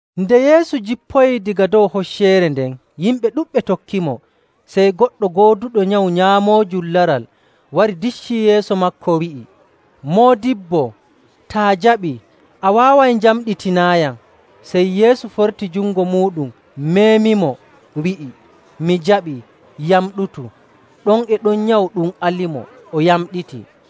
Nde Yeesu jippoyii daga dow hocceere nden, yimɓe ɗuɗɓe tokkimo. Sey goɗɗo gooduɗo nyawu nyaamoojum laral wari diccii yeeso maako, wi'i, “Moodibbo, taa jaɓii, a waaway njamɗitinaayam.” Sey Yeesu forti jungo muuɗum, meemimo, wi'i, “Mi jaɓii. Yamɗutu!” Ɗon e ɗon nyawu ɗum alimo, o yamɗiti.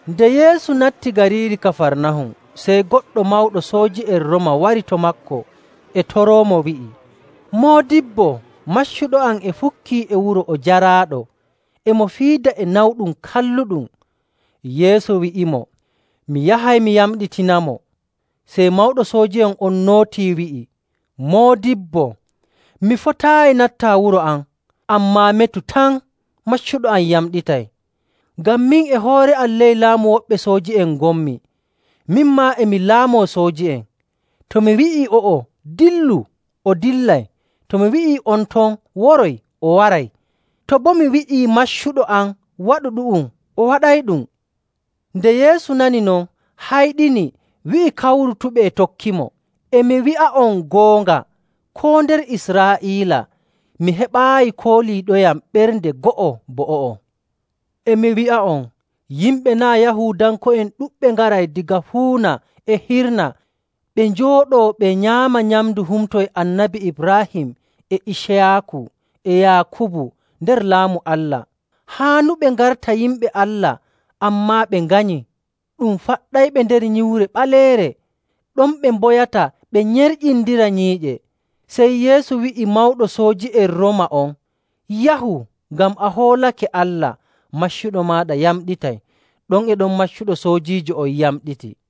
Nde Yeesu natti gariiri Kafarnahum, sey goɗɗo mawɗo sooji'en Rooma wari to maako, e toroomo, wi'i, “Moodibbo, maccuɗo am e fukkii e wuro o jaraaɗo, e mo fiida e nawɗum kalluɗum.” Yeesu wi'imo, “Mi yahay mi yamɗitinamo.” Sey mawɗo sooji'en on nootii wi'i, “Moodibbo, mi fotaayi nattaa wuro am, ammaa metu tan, maccuɗo am yamɗitay. Ngam min e hoore am ley laamu woɓɓe sooji'en ngonmi, min maa, e mi laamoo sooji'en. To mi wi'ii o'o, ‘Dillu!’ o dillay. To mi wi'ii on ton, ‘Woroy!’ o waray. To boo mi wi'ii maccuɗo am, ‘Waɗu ɗu'um!’ o waɗayɗum.” Nde Yeesu nani non, hayɗini, wi'i kawrutuɓe e tokkimo, “E mi wi'a'on goonga, koo nder Israa'iila mi heɓaayi kooliiɗoyam ɓernde go'o bo o'o. E mi wi'a'on, yimɓe naa' Yahuudanko'en ɗuɗɓe ngaray daga fuuna e hirna ɓe njooɗoo ɓe nyaama nyamndu humto e Annabi Ibraahim, e Iciyaaku, e Yaakubu nder Laamu Allah.. Haanuɓe ngarta yimɓe Allah ammaa ɓe nganyi, ɗum faɗɗayɓe nder nyiwre ɓaleere. Ɗon ɓe mboyata ɓe nyerƴindira nyiiƴe.”. Sey Yeesu wi'i mawɗo sooji'en Rooma on, “Yahu! Ngam a hoolake Allah, maccuɗo maaɗa yamɗitay.” Ɗon e ɗon maccuɗo soojiijo on yamɗiti.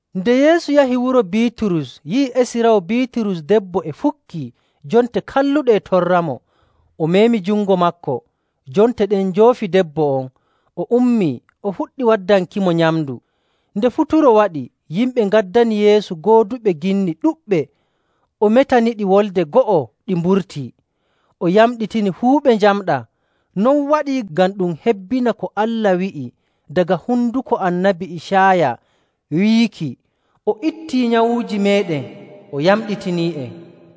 Nde Yeesu yahi wuro Biiturus yi'i esiraawo Biiturus debbo e fukkii, jonte kalluɗe e torramo, o meemi jungo maako. Jonte ɗen njoofi debbo on, o ummii, o fuɗɗi waddankimo nyamndu. Nde futuro waɗi, yimɓe ngaddani Yeesu gooduɓe ginni ɗuɗɓe. O metaniɗi wolde go'o ɗi mburtii. O yamɗitini fuu ɓe njamɗaa. Non waɗii ngam ɗum hebbina ko Allah wi'i daga honduko Annabi Icaaya, wiiki, “O ittii nyawuuji meeɗen, o yamɗitinii'en.”.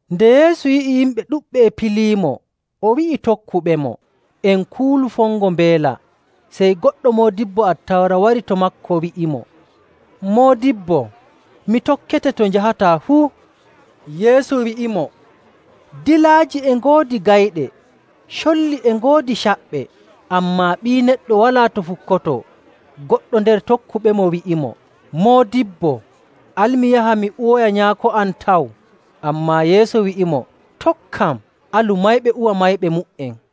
Nde Yeesu yi'i yimɓe ɗuɗɓe e piliimo, o wi'i tokkuɓemo, “En kuulu fongo mbeela.” Sey goɗɗo moodibbo Attawra wari to maako, wi'imo, “Moodibbo, mi tokkete to njahataa fuu.” Yeesu wi'imo, “Dilaaji e ngoodi gayɗe, colli e ngoodi caɓɓe, ammaa Ɓii Neɗɗo walaa to fukkotoo.” Goɗɗo nder tokkuɓemo wi'imo, “Moodibbo, al mi yaha mi uwoya nyaako am taw.” Ammaa Yeesu wi'imo, “Tokkam, alu mayɓe uwa mayɓe mu''en.”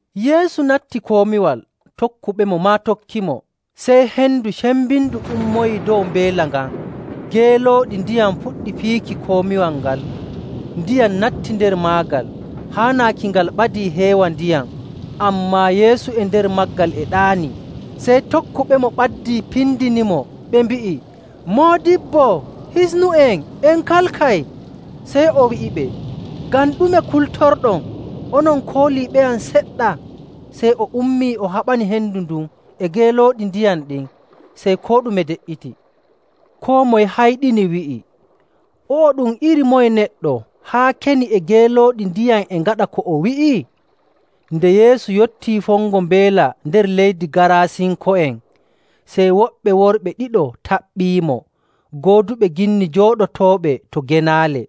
Yeesu natti komiwal, tokkuɓemo maa tokkimo. Sey hendu cembindu ummoyii dow mbeela ngan, geelooɗi ndiyam puɗɗi piiki komiwal ngal, ndiyam natti nder maagal haa naaki ngal ɓadii heewa ndiyam, ammaa Yeesu e nder maagal e ɗaanii. Sey tokkuɓemo ɓaddii pindinimo, ɓe mbi'i, “Moodibbo, hisnu'en! En kalkay!” Sey o wi'iɓe, “Ngam ɗume kultorɗon, onon kooliiɓeyam seɗɗa?” Sey o ummii, o haɓani hendu ndun e geelooɗi ndiyam ɗin. Sey koo ɗume de''iti. Koo moye hayɗini wi'i, “O'o ɗum iri moye neɗɗo, haa keni e geelooɗi ndiyam e ngaɗa ko o wi'i?” Nde Yeesu yottii fongo mbeela nder leydi Gaarasinko'en, sey woɓɓe worɓe ɗiɗo taɓɓiimo, gooduɓe ginni jooɗotooɓe to genaale.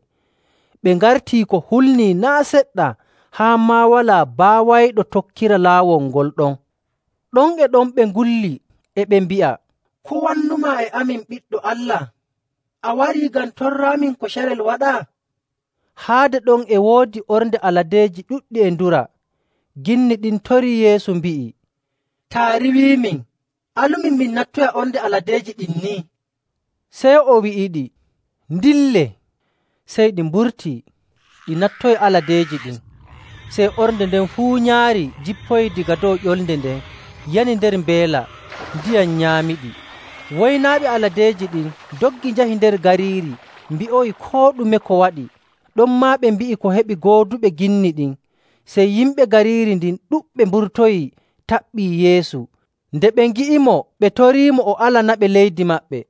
Ɓe ngartii ko hulnii naa' seɗɗa haa maa walaa baawayɗo tokkira laawol ngol ɗon! Ɗon e ɗon ɓe ngulli, e ɓe mbi'a, “Ko wannumaa e amin, Ɓiɗɗo Allah? A warii ngam torraamin ko carel: Waato Nyalnde Jaango. waɗa?” Haade ɗon e woodi ornde aladeeji ɗuɗɗi e dura. Ginni ɗin torii Yeesu, mbi'i, “Taa riiwiimin, alumin min nattoya ornde aladeeji ɗin nii.” Sey o wi'iɗi, “Ndillee!” Sey ɗi mburtii, ɗi nattoyi aladeeji ɗin. Sey ornde nden fuu nyaari jippoyii daga dow ƴolde nden, yani nder mbeela, ndiyam nyaamiɗi. Woynaaɓe aladeeji ɗin ndoggi njahi nder gariiri mbi'oyi koo ɗume ko waɗi. Ɗonmaa ɓe mbi'i ko heɓi gooduɓe ginni ɗin. Sey yimɓe gariiri ndin ɗuɗɓe mburtoyii taɓɓii Yeesu. Nde ɓe ngi'imo, ɓe toriimo o alanaɓe leydi maɓɓe.